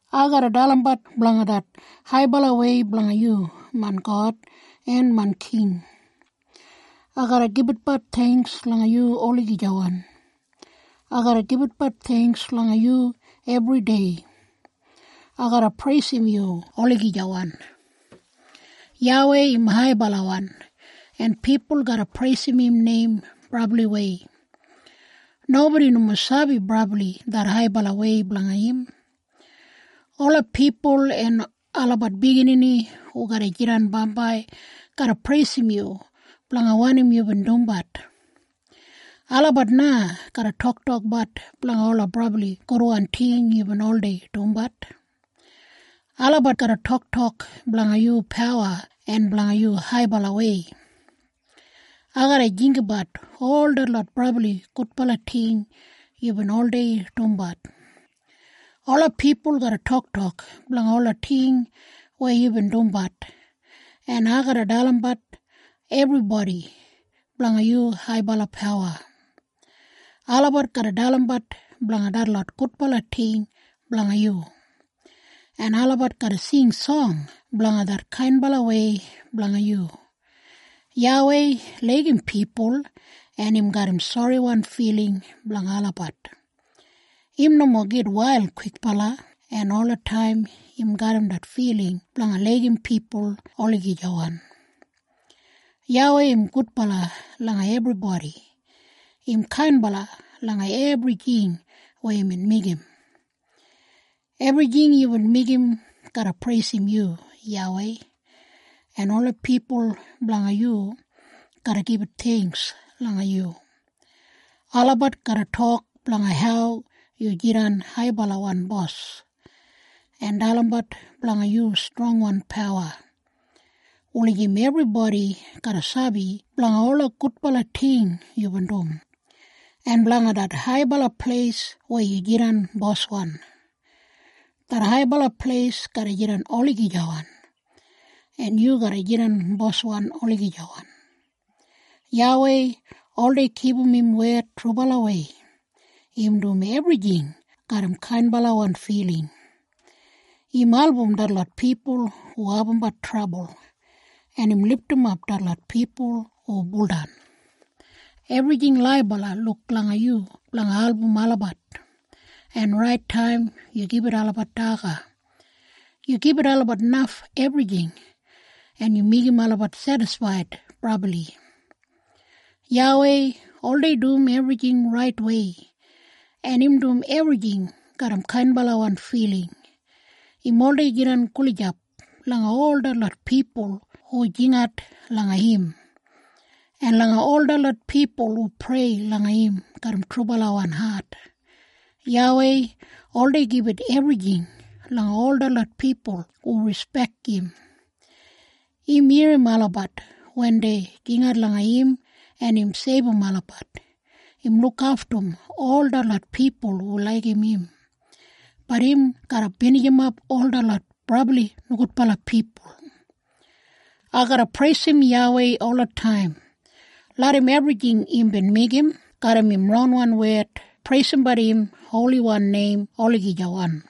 Ai garra dalimbat blanga det haibalawei blanga yu, main God, en main king, Ai garra gibitbat theingks langa yu olagijawan. Ai garra gibitbat theingks langa yu ebridei. Ai garra preisim yu olagijawan. YAWEI im haibalawan en pipul garra preisim im neim brabliwei. Nobodi nomo sabi brabli det haibalawei blanga im. Ola pipul en olabat biginini hu garra jidan bambai garra preisim yu blanga wanim yubin dumbat. Olabat na garra toktokbat blanga ola brabli gudwan ting yubin oldei dumbat. Olabat garra toktok blanga yu pawa en blanga yu haibalawei. Ai garra jinggabat ol detlot brabli gudbala ting yubin oldei dumbat. Ola pipul garra toktok blanga ola ting weya yubin dumbat, en ai garra dalimbat ebribodi blanga yu haibala pawa. Olabat garra dalimbat blanga detlot gudbala ting blanga yu, en olabat garra sing song blanga det kainbalawei blanga yu. YAWEI laigim pipul en im garram soriwan filing blanga olabat. Im nomo gitwail kwikbala en olataim im garram det filing blanga laigim pipul olagijawan. YAWEI im gudbala langa ebribodi. Im kainbala langa ebrijing weya imbin meigim. Ebrijing yubin meigim garra preisim yu YAWEI, en ola pipul blanga yu garra gibit theingks langa yu. Olabat garra tok blanga hau yu jidan haibalawan bos, en dalimbat blanga yu strongwan pawa, wulijim ebribodi garra sabi blanga ola gudbala ting yubin dum, en blanga det haibala pleis weya yu jidan boswan. Det haibala pleis garra jidan olagijawan, en yu garra jidan boswan olagijawan. YAWEI oldei kipum im wed trubalawei. Im dum ebrijing garram kainbalawan filing. Im album detlot pipul hu abumbat trabul, en im lidimap detlot pipul hu buldan. Ebrijing laibala luk langa yu blanga album olabat, en rait taim yu gibit olabat daga. Yu gibit olabat naf ebrijing, en yu meigim olabat sedisfaid brabli. YAWEI oldei dum ebrijing raitwei, en im dum ebrijing garram kainbalawan filing. Im oldei jidan gulijap langa ol detlot pipul hu jingat langa im, en langa ol detlot pipul hu prei langa im garram trubalawan hat. YAWEI oldei gibit ebrijing langa ol detlot pipul hu rispek im. Im irrim olabat wen dei jingat langa im en im seibum olabat. Im lukaftum ol detlot pipul hu laigim im, bat im garra binijimap ol detlot brabli nogudbala pipul. Ai garra preisim YAWEI olataim. Larram ebrijing imbin meigim garram im ronwan wed preisimbat im holiwan neim olagijawan.